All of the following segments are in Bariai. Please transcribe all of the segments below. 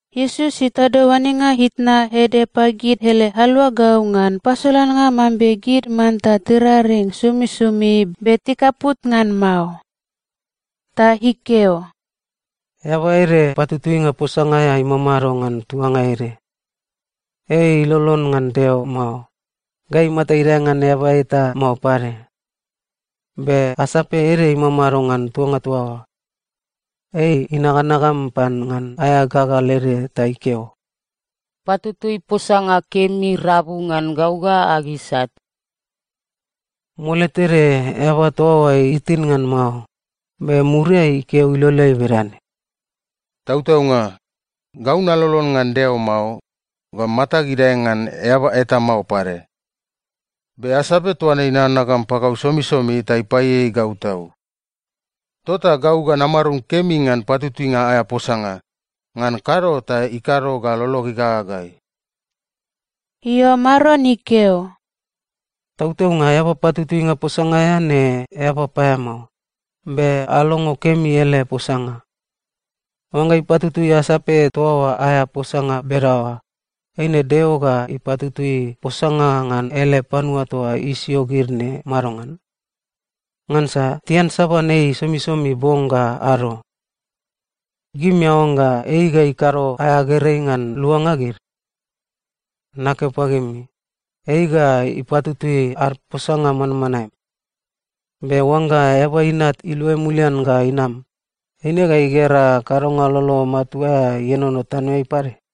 Iesus itado oanenga itna ede pagid ele aluagau ngan pasolannga mambe gid manta tiraring somisomi be tikaput ngan mao. Ta ikeo, “Eaba ede patutuinga posanga aea imamado ngan tuanga ede. Ei ilolon ngan Deo mao, ga imata idae ngan eaba eta mao pade. Be asape ede imamado ngan tuanga toa oa. Ei inaganagam pan ngan aea gagal ede ta ikeo, ‘Patutui posanga kemi rabu ngan gau ga ag isat.’ “Mole tede eaba toa oa itin ngan mao, be muriai ikeo iloleai bedane, ‘Tautaunga, gau nalolon ngan Deo mao, ga matag idae ngan eaba eta mao pade. Be asape toa ne inaganagam pagau somisomi ta ipaieiei gau tau. Tota gau ga namarum kemi ngan patutuinga aea posanga, ngan kado ta ikado ga lolog igagagai.’” Io, Maron ikeo, “Tautaunga eaba patutuinga posanga aea ne eaba paeamao, be alongo kemi ele posanga. Oangga ipatutui asape toa oa aea posanga bedaoa, eine Deo ga ipatutui posanga ngan ele panua toa isio gid ne madongan? Ngansa tiansaban ei somisomi bong ga ado. Gimi aoangga ei ga ikado aea gerei ngan luanga gid? Nakeo pagimi, ei ga ipatutui ad posanga manmanae. Be oangga Eaba Inat iluai mulian ga inam, eine ga igera kadonga lolo matua aea ienono tanoeai pade?”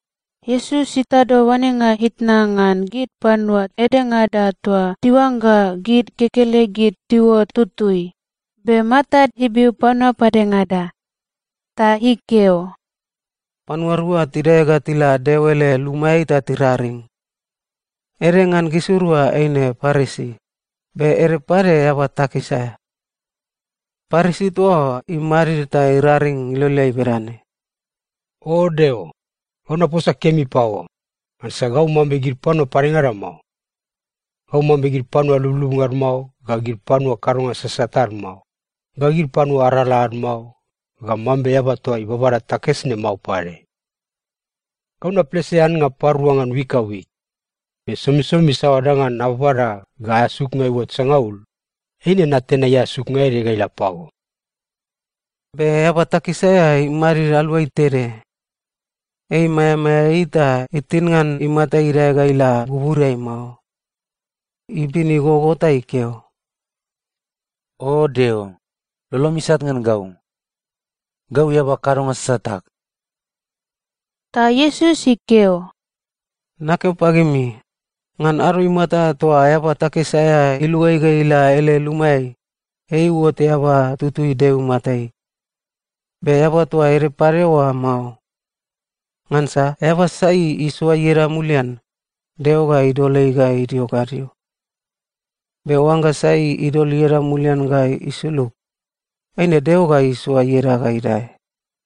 Iesus itado oanenga itna ngan gid panua edengada toa tiuangga gid kekelegid tiuot tutui, be matad ibiu panua padengada. Ta ikeo, “Panua rua tidae ga tila Deo ele lumaeai ta tiraring. Ede ngan gisirua eine Parisi, be ede pade eaba takis aea. Parisi toa oa imadid ta iraring iloleai bedane, ‘O Deo, gau naposa kemi pago, ngansa gau mambe gid panua padengada mao. Gau mambe gid panua lublubnga ad mao, ga gid panua kadonga sasat ad mao, ga gid panua arala ad mao, ga mambe eaba toa ibabada takis ne mao pade. Gau naplese annga parua ngan wik ga wik, be somisomi saoa danga nababada ga aea suknga iuot sangaul, eine natenai aea suknga ede ga ila pago.’ “Be eaba takis aea imadid aluai tede. Ei maeamaea ei ta itin ngan imata idae ga ila buburiai mao. Ibin igogo ta ikeo, ‘O Deo, lolom isat ngan gau. Gau eaba kadonga sasat ag.’” Ta Iesus ikeo, “Nakeo pagimi, ngan ado imata toa eaba takis aea iluai ga ila ele lumaeai, ei iuot eaba tutui Deo imatai, be eaba toa ede pade oa mao. Ngansa eaba sai isoa ieda mulian, Deo ga idol ei ga idio gadio. Be oangga sai idol ieda mulian ga isulug, eine Deo ga isoa ieda ga idae.”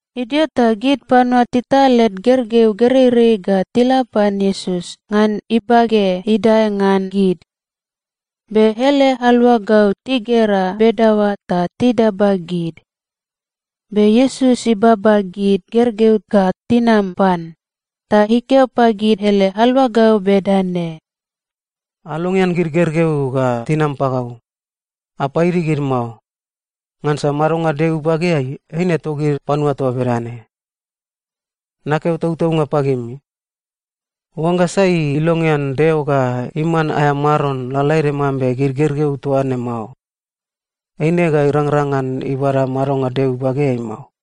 Idio ta gid panua tital led gergeu gereirei ga tila pan Iesus ngan ibage idae ngan gid. Be ele aluagau tigera bedaoa ta tidaba gid. Be Iesus ibaba gid gergeu ga tinam pan, ta ikeo pagid ele aluagau bedane, “Alongean gid gergeu ga tinam pagau. Apaidi gid mao. Ngansa madonga Deo ibageai, eine togid panua toa bedane. Nakeo tautaunga pagimi, oangga sai ilongean Deo ga iman aea Maron lalaede mambe gid gergeu toa ne mao, eine ga irangrang ngan ibada madonga Deo ibageai mao.”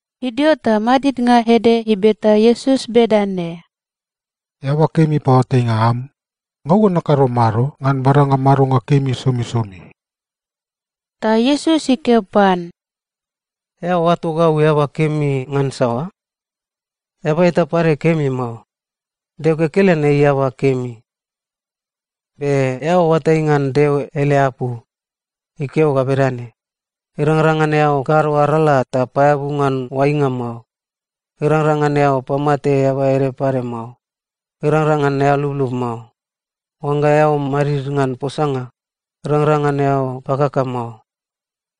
Idio ta madidnga ede ibeta Iesus bedane, “Eaba kemi paoatainga am, gau ga nakado mado ngan badanga madonga kemi somisomi?” Ta Iesus ikeo pan, “Eao oato gau eaba kemi ngan saoa? Eaba eta pade kemi mao. Deo kekelen ei eaba kemi. Be eao oatai ngan Deo ele apu. Ikeo ga bedane, ‘Irangrang ngan eao kado arala ta paeabu ngan oainga mao. Irangrang ngan eao pamate eaba ede pade mao. Irangrang ngan eao lublub mao. Oangga eao madid ngan posanga, irangrang ngan eao pakaka mao.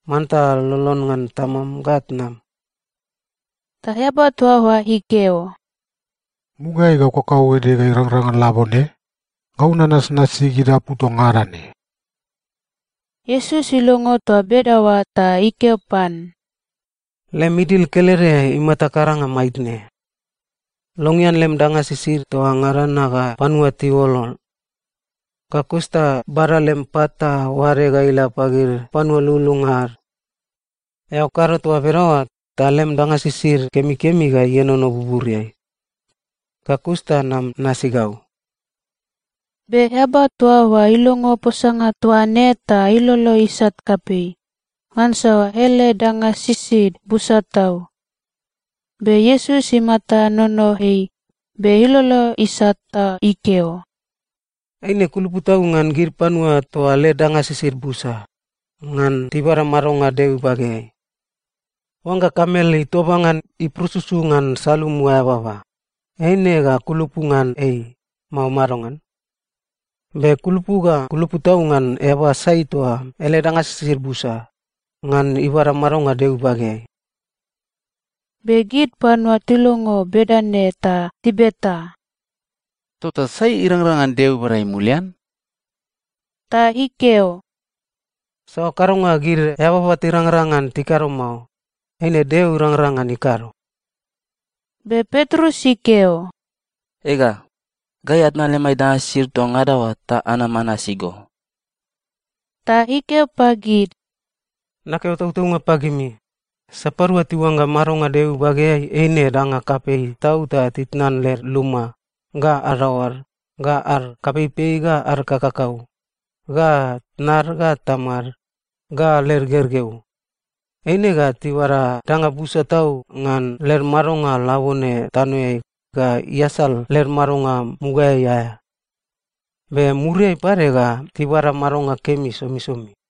Manta lolon ngan tamam ga tnam.’” Ta eaba toa oa ikeo, “Mugaeai gau kakauede ga irangrang ngan labone, gau nanasnasi gid apu toa ngada ne.” Iesus ilongo toa bedaoa ta ikeo pan, “Lem idil kelede imata karanga maitne. Longean lem danga sisid toa ngada na ga panua tiuolol, ga kus ta bada lem pat ta oade ga ila pagid panua lululunga ad. Eao kado toa bedaoa, ta lem danga sisid kemikemi ga ienono buburiai. Ga kus ta nam nasi gau.” Be eaba toa oa ilongo posanga toa ne ta ilolo isat kapei, ngansa ele danga sisid busa tau. Be Iesus imata inono ei be ilolo isat ta ikeo, “Eine kulupu tau ngan gid panua toa led danga sisid busa, ngan tibada madonga Deo ibageai. Oangga kamel itoba ngan ipurususu ngan salumu aea baba, eine ga kulupu ngan ei, mao madongan? Be kulupu ga kulupu tau ngan eaba sai toa ele danga sisid busa, ngan ibada madonga Deo ibageai.” Be gid panua tilongo bedane ta tibeta, “Tota sai irangrang ngan Deo ibada ei mulian?” Ta ikeo, “Saoa kadonga gid eababa tirangrang ngan tikado mao, eine Deo irangrang ngan ikado.” Be Petrus ikeo, “Ega, gai atnan lemai danga sisid toa ngada oa ta anam anasi go!” Ta ikeo pagid, “Nakeo tautaunga pagimi, sapadua tiuangga madonga Deo ibageai eine danga kapei tau ta titnan led luma, ga adaoad, ga ad kapeipei ga ad kakakau, ga tnad ga tamad, ga led gergeu, eine ga tibada danga busa tau ngan led madonga labone tanoeai ga iasal led madonga mugaeai aea. Be muriai pade ga tibada madonga kemi somisomi.”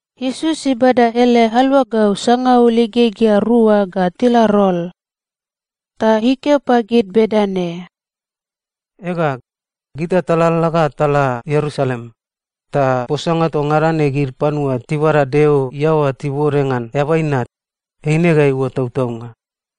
Iesus ibada ele aluagau sangaul igegea rua ga tila rol, ta ikeo pagid bedane, “Ega, gita talalala ga tala Ierusalem, ta posanga toa ngada ne gid panua tibada Deo iaoa tibode ngan Eaba Inat, eine ga iuot tautaunga.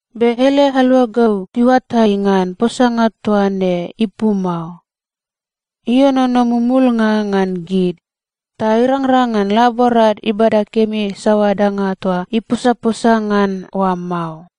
Be ele aluagau tiuatai ngan posanga toa ne ipu mao. Ienono mumulnga ngan gid, ta irangrang ngan laborad ibada kemi saoa danga toa iposaposa ngan oa mao.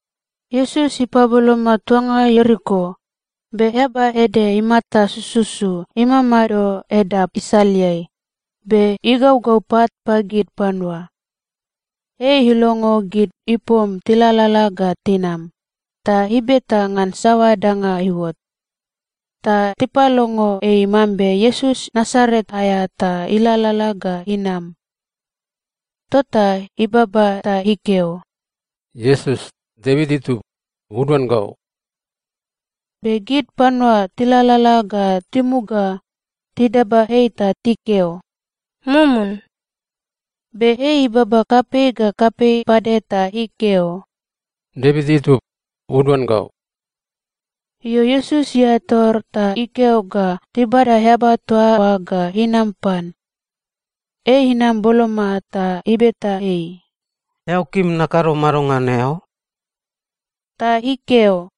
Iesus ipaboloma tuanga Ieriko, be eaba ede imata sususu imamado edap isaleai, be igaugau pat pagid panua. Ei ilongo gid ipom tilalala ga tinam, ta ibeta ngan saoa danga iuot. Ta tipalongo ei mambe Iesus Nasaret aea ta ilalala ga inam. Tota ibaba ta ikeo, “Iesus, Devit itub, uduan gau!” Be gid panua tilalala ga timuga, tidaba ei ta tikeo, “Mumun!” Be ei ibaba kapei ga kapei pade ta ikeo, “Devit itub, uduan gau!” Io, Iesus iae tor ta ikeo ga tibada eaba toa oa ga inam pan. Ei inam boloma, ta ibeta ei, “Eao kim nakado mado ngan eao?” Ta ikeo,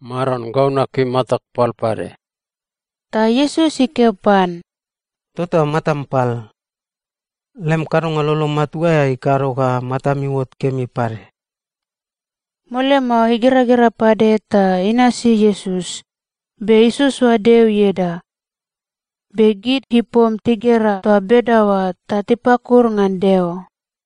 “Maron, gau nakim matag pal pade.” Ta Iesus ikeo pan, “Tota matam pal. Lem kadonga lolo matua aea ikado ga matam iuot kemi pade.” Mole mao, igeragera pade ta inasi Iesus, be isoasoa Deo ieda. Be gid ipom tigera toa bedaoa, ta tipakuru ngan Deo.